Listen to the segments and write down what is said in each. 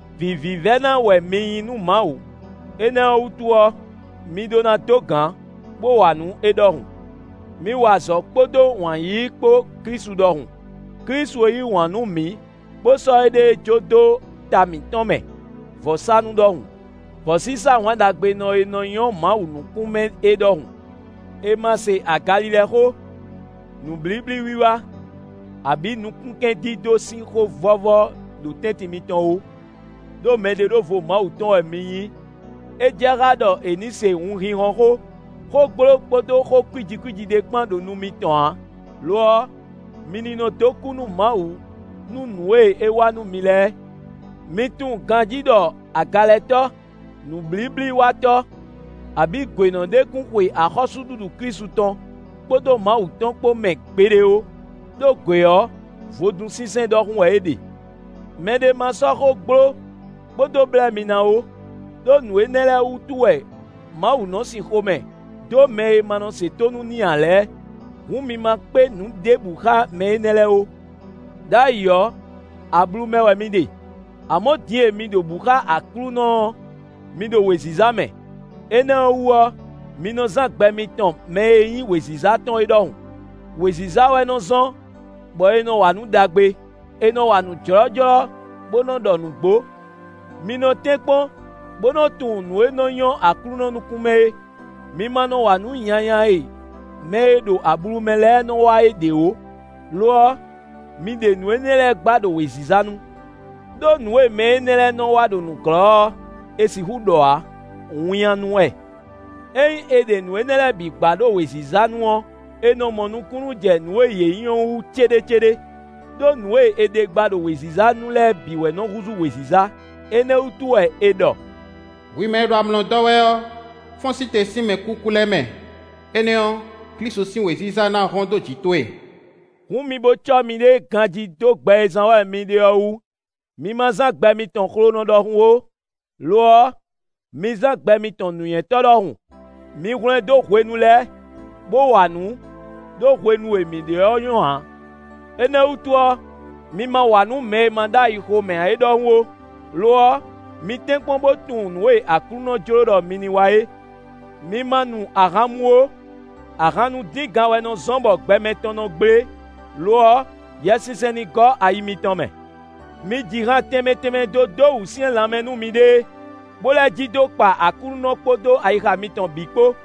Vǐ vívɛ́ná wɛ mi nyí nú Mawu; énɛ́ ɔ́ wútu ɔ́, mi ɖó ná dó gǎn, bó wa nǔ é ɖɔhun. Mi wa azɔ̌ kpódó wǎn yíyí kpó Klísu ɖɔhun. Klísu e yí wǎn nú mǐ bó sɔ́ éɖée jó dó ta mitɔn mɛ vɔ̌sánú ɖɔhun, vɔ̌sísá wǎn ɖagbenɔ e nɔ nyɔ́ Mawu nukún mɛ é ɖɔhun. È ma se agalilɛ xó, nǔblíblíwiwa, abǐ nukúnkɛndídó sín xó vɔ́vɔ́ ɖo tɛ́ntin mitɔn ó; ɖó mɛɖeɖóvo Mawu tɔn wɛ mi nyí. É jɛ xá ɖɔ è nǐ se wunhínhɔ́n xó, xó gbló kpódó xó kwíji kwíji ɖé kpán ɖo nu mitɔn ǎ; lo ɔ́, mi ní nɔ dó kú nú Mawu nú nǔ e é wa nú mi lɛ́ɛ. Mi tunwun ganjí ɖɔ agalɛtɔ́, nǔblíblíwatɔ́ abǐ gwěnɔ ɖé kún xwe axɔ́súɖuɖu Klísu tɔn kpódó Mawu tɔn kpó mɛ gbeɖé ó; ɖó gwě ɔ́, vodúnsinsɛn ɖɔhun wɛ é ɖe. Mɛ ɖé ma sɔ́ xó gbló bó dó blɛ́ mi ná ó, ɖó nǔ énɛ́ lɛ́ɛ wútu wɛ Mawu nɔ sin xomɛ dó mɛ e ma nɔ se tónú n'i ǎ lɛ́ɛ. Hǔn mi ma kpé nǔ ɖěbǔ xá mɛ énɛ́ lɛ́ɛ ó. Đ'ayǐ ɔ́, ablu mɛ wɛ mi ɖe; amɔ̌ din e mi ɖo bǔ xa Aklúnɔ ɔ́, mi ɖo wěziza mɛ; énɛ́ ɔ́ wú ɔ́, mi nɔ zán gbɛ mitɔn mɛ e nyí wěziza tɔn é ɖɔhun. Wěziza wɛ nɔ zɔ́n, bɔ è nɔ wa nǔ ɖagbe; è nɔ wa nǔ jlɔ́jlɔ́ bó nɔ́ ɖɔ nǔgbó. Mi nɔ́ tɛ́nkpɔ́n bó nɔ́ tunwun nǔ e nɔ́ nyɔ́ Aklúnɔ nukún mɛ é. Mi ma nɔ wa nǔ nyanya e mɛ e ɖo ablu mɛ lɛ́ɛ nɔ wa é ɖě ó; lo ɔ́, mi ɖe nǔ énɛ́ ɔ́ lɛ́ɛ gba ɖo wěziza nu. Đó nǔ e mɛ énɛ́ lɛ́ɛ nɔ wa ɖo nǔglɔ́ ɔ́, è sixú ɖɔ ǎ; winnyánú wɛ. Ényí è ɖe nǔ énɛ́ lɛ́ɛ bǐ gba ɖo wěziza nu ɔ́, è nɔ mɔ nukúnnú jɛ nǔ e yě nyí ɔ́ wú céɖécéɖé. Đó nǔ e è ɖe gba ɖo wěziza nu lɛ́ɛ bǐ wɛ nɔ́ húzú wěziza; énɛ́ wútu wɛ è ɖɔ: “Hwi mɛ e ɖo amlɔ dɔ́ wɛ ɔ́, fɔ́n sí te sín mɛkúkú lɛ́ɛ mɛ; énɛ́ ɔ́, Klísu sín wěziza ná hɔ́n dó jǐ towe.” Hǔn mi bo cɔ́ miɖée ganjí dó gbɛ e zán wɛ mi ɖe ɔ́ wú. Mi ma zán gbɛ mitɔn xlonɔ ɖɔhun ó; lo ɔ́, mi zán gbɛ mitɔn nǔnywɛ́tɔ́ ɖɔhun. Mi hwlɛndó hwenu lɛ́ɛ, bó wa nǔ; ɖó hwenu e mǐ ɖe ɔ́ nyɔ́ ǎ. Énɛ́ ɔ́ wútu ɔ́, mi ma wa nǔ mɛ e ma ɖó ayi xomɛ ǎ é ɖɔhun ó; lo ɔ́, mi tɛ́nkpɔ́n bó tunwun nǔ e Aklúnɔ jló ɖɔ mi ní wa é. Mi ma nu ahan mú ó; ahan nu díngan wɛ nɔ zɔ́n bɔ gbɛ mɛtɔn nɔ gblé; lo ɔ́, Yɛsinsɛn ní gɔ́ ayi mitɔn mɛ. Mi ji han tɛnmɛ tɛnmɛ dó dó wǔsyɛ́n lanmɛ nú miɖée, bó lɛ́ ji dó kpa Aklúnɔ kpódó ayixa mitɔn bǐ kpó.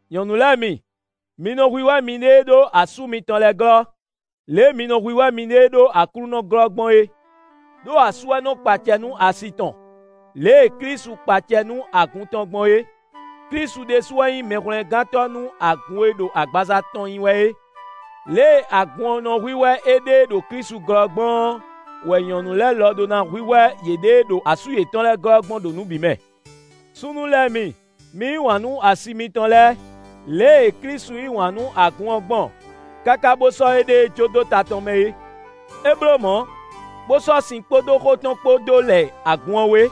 Nyɔ̌nu lɛ́ɛ mi, mi nɔ hwíhwɛ́ miɖée ɖó asú mitɔn lɛ́ɛ glɔ́, lě e mi nɔ hwíhwɛ́ miɖée ɖó Aklúnɔ glɔ́ gbɔn é. Đó asú wɛ nɔ kpa acɛ nú asi tɔn, lě e Klísu kpa acɛ nú agun tɔn gbɔn é. Klísu ɖésú wɛ nyí Mɛhwlɛ́ngántɔ́ nú agun e ɖo agbaza tɔn nyí wɛ é. Lě e agun ɔ́ nɔ hwíhwɛ́ éɖée ɖo Klísu glɔ́ gbɔn ɔ́ wɛ nyɔ̌nu lɛ́ɛ lɔ ɖo ná nɔ́ hwíhwɛ́ yěɖée ɖó asú yětɔn lɛ́ɛ glɔ́ gbɔn ɖo nǔ bǐ mɛ. Súnnu lɛ́ɛ mi, mi yí wǎn nú asi mitɔn lɛ́ɛ, lě e Klísu yí wǎn nú agun ɔ́ gbɔn káká bó sɔ́ éɖée jó dó ta tɔn mɛ é. É bló mɔ̌, bó sɔ́ sin kpódó xó tɔn kpó dó lɛ agun ɔ́ wé,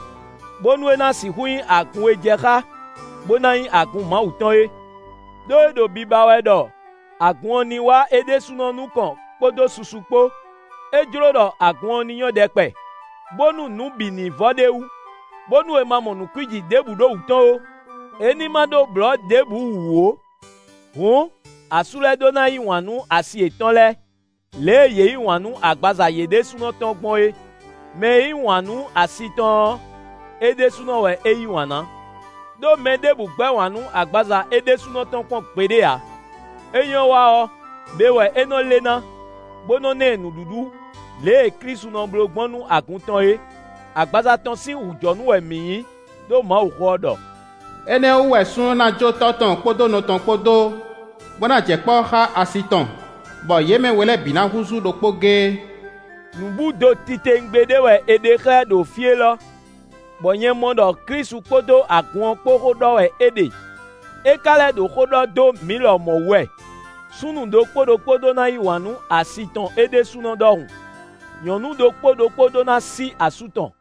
bónú é ná sixú nyí agun e jɛ xá bó ná nyí agun Mawu tɔn é. Đó é ɖo biba wɛ ɖɔ agun ɔ́ ní wá é ɖésúnɔ nukɔn kpódó susu kpó; é jló ɖɔ agun ɔ́ ní nyɔ́ ɖɛkpɛ, bónú nǔ bǐ ní vɔ ɖ'é wú, bónú è ma mɔ nǔ kwíji ɖěbǔ ɖo wǔ tɔn ó; é ní ma ɖó blɔ̌ ɖěbǔ wǔ ó. Hǔn, asú lɛ́ɛ ɖó ná yí wǎn nú asi yětɔn lɛ́ɛ, lě e yě yí wǎn nú agbaza yě ɖésúnɔ tɔn gbɔn é. Mɛ e yí wǎn nú asi tɔn ɔ́, é ɖésúnɔ wɛ é yí wǎn ná. Đó mɛ ɖěbǔ gbɛ́ wǎn nú agbaza é ɖésúnɔ tɔn kpɔ́n gbeɖé ǎ; é nyɔ́ wa ɔ́, be wɛ é nɔ́ lé ná, bó nɔ ná ɛ nǔɖuɖu, lě e Klísu nɔ bló gbɔn nú agun tɔn é; agbaza tɔn sín wǔjɔnú wɛ mǐ nyí. Đó Mawuxó ɔ́ ɖɔ: “Énɛ́ ɔ́ wú wɛ súnnu ná jó tɔ́ tɔn kpódó nɔ tɔn kpó dó, bó ná jɛ kpɔ́ xá asi tɔn, bɔ yě mɛ we lɛ́ɛ bǐ ná húzú ɖokpó géé.” Nǔbúdo titewungbe ɖé wɛ è ɖe xlɛ́ ɖo fí élɔ́, bɔ nyɛ mɔ ɖɔ Klísu kpódó agun ɔ́ kpó xó ɖɔ wɛ é ɖe. É ka lɛ́ ɖo xó ɖɔ dó mǐ lɔmɔ̌ wú wɛ: súnnu ɖokpó ɖokpó ɖó ná yí wǎn nú asi tɔn é ɖésúnɔ ɖɔhun; nyɔ̌nu ɖokpó ɖokpó ɖó ná sí asú tɔn.